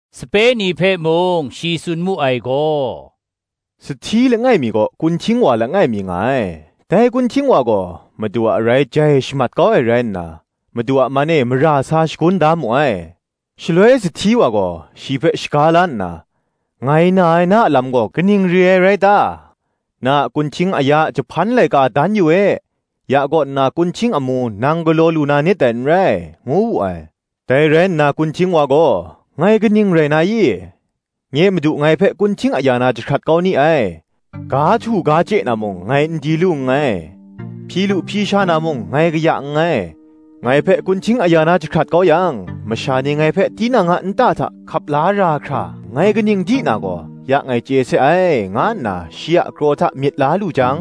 Sape ni hpe mung shi tsun mu ai gaw, “Sahti langai mi kaw kunhting wa langai mi nga ai; dai kunhting wa gaw madu a arai jai shamat kau ai rai nna, madu a man e mara sa shagun da mu ai. Shaloi sahti wa gaw shi hpe shaga la nna, ‘Ngai na ai, na a lam gaw kaning re ai rai ta? na a kunhting aya a jahpan laika dan yu e; ya kaw nna kunhting amu nang galaw lu na nit dai n rai,’ ngu wu ai. Dai rai nna kunhting wa gaw, ‘Ngai kaning rai na i? nye madu ngai hpe kunhting aya na jahkrat kau ni ai: ga htu ga chye na mung, ngai n di lu nngai; hpyi lu hpyi sha na mung, ngai kaya nngai: ngai hpe kunhting aya na jahkrat kau yang, masha ni ngai hpe tinang a nta hta hkap la ra hkra, ngai kaning di na gaw, ya ngai chye se ai, nga nna shi a kraw hta myit la lu jang,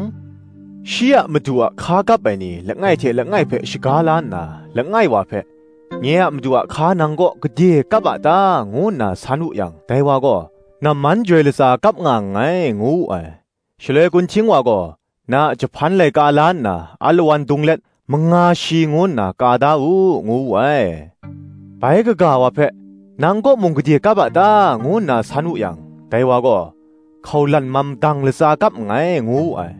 shi a madu a hka kap ai ni langai hte langai hpe shaga la nna, langai wa hpe, ‘Nye a madu a hka nang kaw gade kap a ta?’ ngu nna san wu yang, dai wa gaw, ‘Namman joi latsa kap nga nngai:’ ngu wu ai. Shaloi kunhting wa gaw, ‘Na a jahpan laika la nna, alawan dung let manga shi ngu nna ka da u,’ ngu wu ai. bai kaga wa hpe, ‘Nang kaw mung gade kap a ta?’ ngu nna san wu yang, dai wa gaw, ‘Hkaulan mam dang latsa kap nngai,’ ngu wu ai.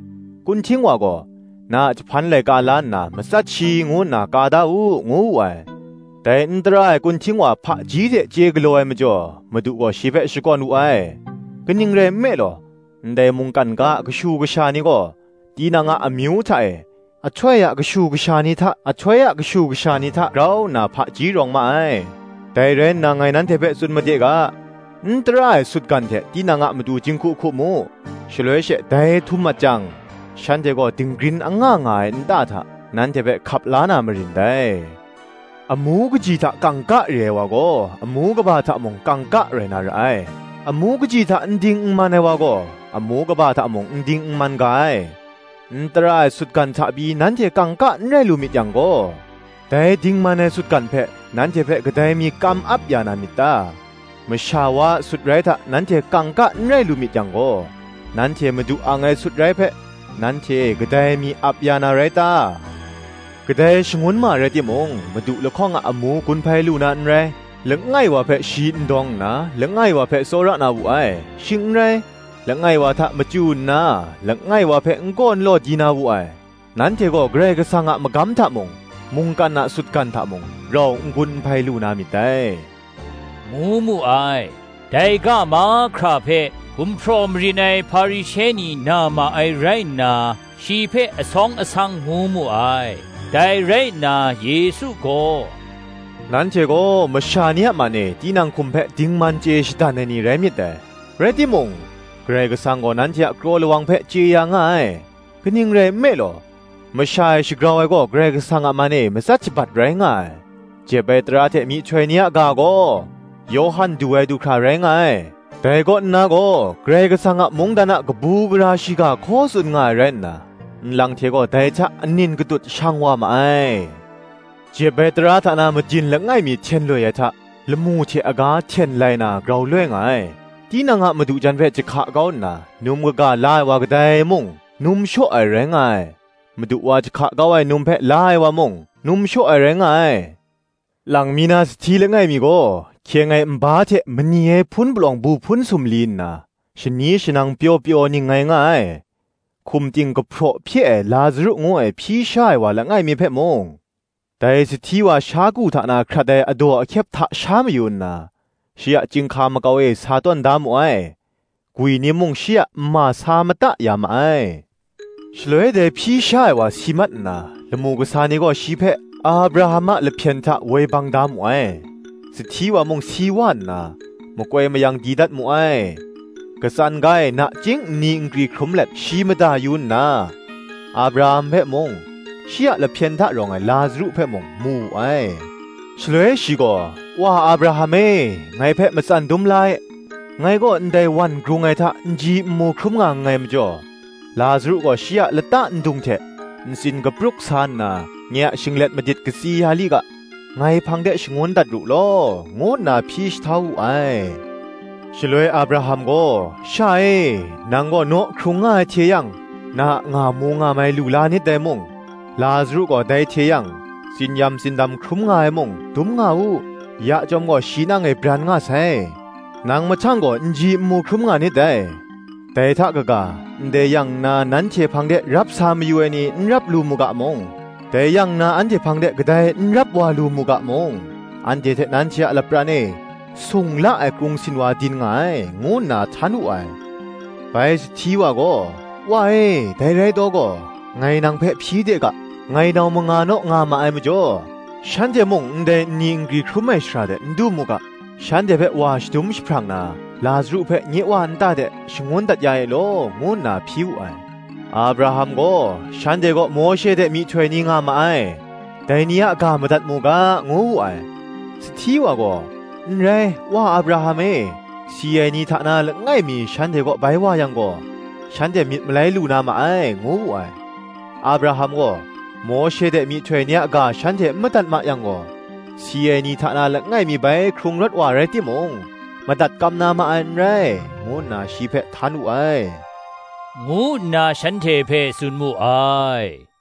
Kunhting wa gaw, ‘Na a jahpan laika la nna, matsat shi ngu nna ka da u,’ ngu wu ai. Dai n tara ai kunhting wa hpaji hte chye galaw ai majaw, madu gaw shi hpe shakawn wu ai: kaning rai nme law, ndai mungkan ga a kashu kasha ni gaw, tinang a amyu hta e, ahtoi a kashu kasha ni hta grau nna hpaji rawng ma ai. Dai rai nna ngai nanhte hpe tsun made ga, n tara ai sutgan hte tinang a matu jinghku hku mu: shaloi she dai htum mat jang, shanhte gaw dinggrin anga nga ai nta hta, nanhte hpe hkap la na marin dai. Amu kaji hta kangka re ai wa gaw, amu kaba hta mung kangka rai na ra ai: amu kaji hta n ding n man ai wa gaw, amu kaba hta mung n ding n man ga ai. N tara ai sutgan hta pyi nanhte kangka n rai lu myit yang gaw, dai dingman ai sutgan hpe, nanhte hpe kadai mi kam ap ya na myit ta? Masha wa a sutrai hta nanhte kangka n rai lu myit yang gaw, nanhte madu ang ai sutrai hpe, nanhte e kadai mi ap ya na rai ta? Kadai shangun ma rai timung, madu lahkawng a amu gun hpai lu ai n rai: langai wa hpe shi n dawng nna, langai wa hpe tsawra na wu ai: shing n rai, langai wa hta machyu nna, langai wa hpe n kaw n law di na wu ai: nanhte gaw Karai Kasang a magam hta mung, mungkan a sutgan hta mung, rau n gun n hpai lu na myit dai,” ngu mu ai. Dai ga mahkra hpe, gumhpraw marin ai Hparishe ni na ma ai rai nna, shi hpe asawng asang ngu mu ai. Dai rai nna Yesu gaw, “Nanhte gaw masha ni a man e tinang hkum hpe dingman chye shadan ai ni rai myit dai; rai timung, Karai Kasang gaw nanhte a kraw lawng hpe chye ya nga ai: kaning rai nme law, masha e shagrau ai gaw Karai Kasang a man e matsat shabat rai nga ai. Jep ai tara hte myihtoi ni a ga gaw, Yawhan du ai du hkra rai nga ai: dai kaw nna gaw Karai Kasang a mungdan a kabu gara shiga hkaw tsun nga ai rai nna, nlang hte gaw dai hta anin katut shang wa ma ai. Jep ai tara hta na madin langai mi hten loi ai hta, lamu hte aga hten lai na grau loi nga ai. Tinang a madu jan hpe jahka kau nna, num kaga la ai wa kadai mung, num shaw ai rai nga ai: madu wa jahka kau ai num hpe la ai wa mung, num shaw ai rai nga ai. Lang mi na sahti langai mi gaw, hkyeng ai nba hte mani ai hpun palawng bu hpun sumli nna, shani shanang pyaw pyaw ningngai nga ai. Hkum ting kahpraw hpye ai Lazaru ngu ai hpyi sha ai wa langai mi hpe mung, dai sahti wa sha ku hta na hkrat ai adaw ahkyep hta sha mayu nna, shi a chyinghka makau e sa tawn da mu ai: gwi ni mung shi a nma sa mata ya ma ai. Shaloi dai hpyi sha ai wa si mat nna, lamu kasa ni gaw shi hpe Abraham a lahpyen hta woi bang da mu ai: sahti wa mung si wa nna, makoi mayang di dat mu ai. Katsan ga e nachying nni nkri hkrum let shi mada yu nna, Abraham hpe mung, shi a lahpyen hta rawng ai Lazaru hpe mung, mu wu ai. Shaloi shi gaw, “Wa Abraham e, ngai hpe matsan dum le e; ngai gaw ndai wan grung ai hta nji nmu hkrum nga nngai majaw, Lazaru gaw shi a lata ndung hte ntsin kapruk sa nna, nye a shinglet madit katsi ya li ga, ngai hpang de shangun dat ru law,” ngu nna hpyi jahtau wu ai. Shaloi Abraham gaw, “Sha e, nang gaw naw hkrung nga ai hte yang, na a ngamu ngamai lu la nit dai mung, Lazaru gaw dai hte yang tsin-yam tsindam hkrum nga ai mung, dum nga u; ya chyawm gaw shi nang e bran nga sai, nang mahtang gaw nji nmu hkrum nga nit dai. Dai hta kaga, ndai yang nna nanhte hpang de rap sa mayu ai ni, n rap lu mu ga mung, dai yang nna anhte hpang de kadai n rap wa lu mu ga mung, anhte hte nanhte a lapran e sung la ai krung sinwa din nga ai, ngu nna htan wu ai. Bai sahti wa gaw, “Wa e, dai rai taw gaw, ngai nang hpe hpyi de ga, ‘Ngai nau manga naw nga ma ai majaw, shanhte mung ndai nni nkri hkrum ai shara de n du mu ga, shanhte hpe wa shadum jahprang na, Lazaru hpe nye wa nta de shangun dat ya e law,’ ngu nna hpyi wu ai. Abraham gaw, ‘Shanhte kaw Mawshe hte myihtoi ni nga ma ai: dai ni a ga madat mu ga,’ ngu wu ai. Sahti wa gaw, ‘N rai, Wa Abraham e; si ai ni hta na langai mi shanhte kaw bai wa yang gaw, shanhte myit malai lu na ma ai,’ ngu wu ai. Abraham gaw, ‘Mawshe hte myihtoi ni a ga shanhte n madat ma yang gaw, si ai ni hta na langai mi bai hkrung rawt wa rai timung, madat kam na ma ai n rai,’ ngu nna shi hpe htan wu ai,” ngu nna shanhte hpe tsun mu ai.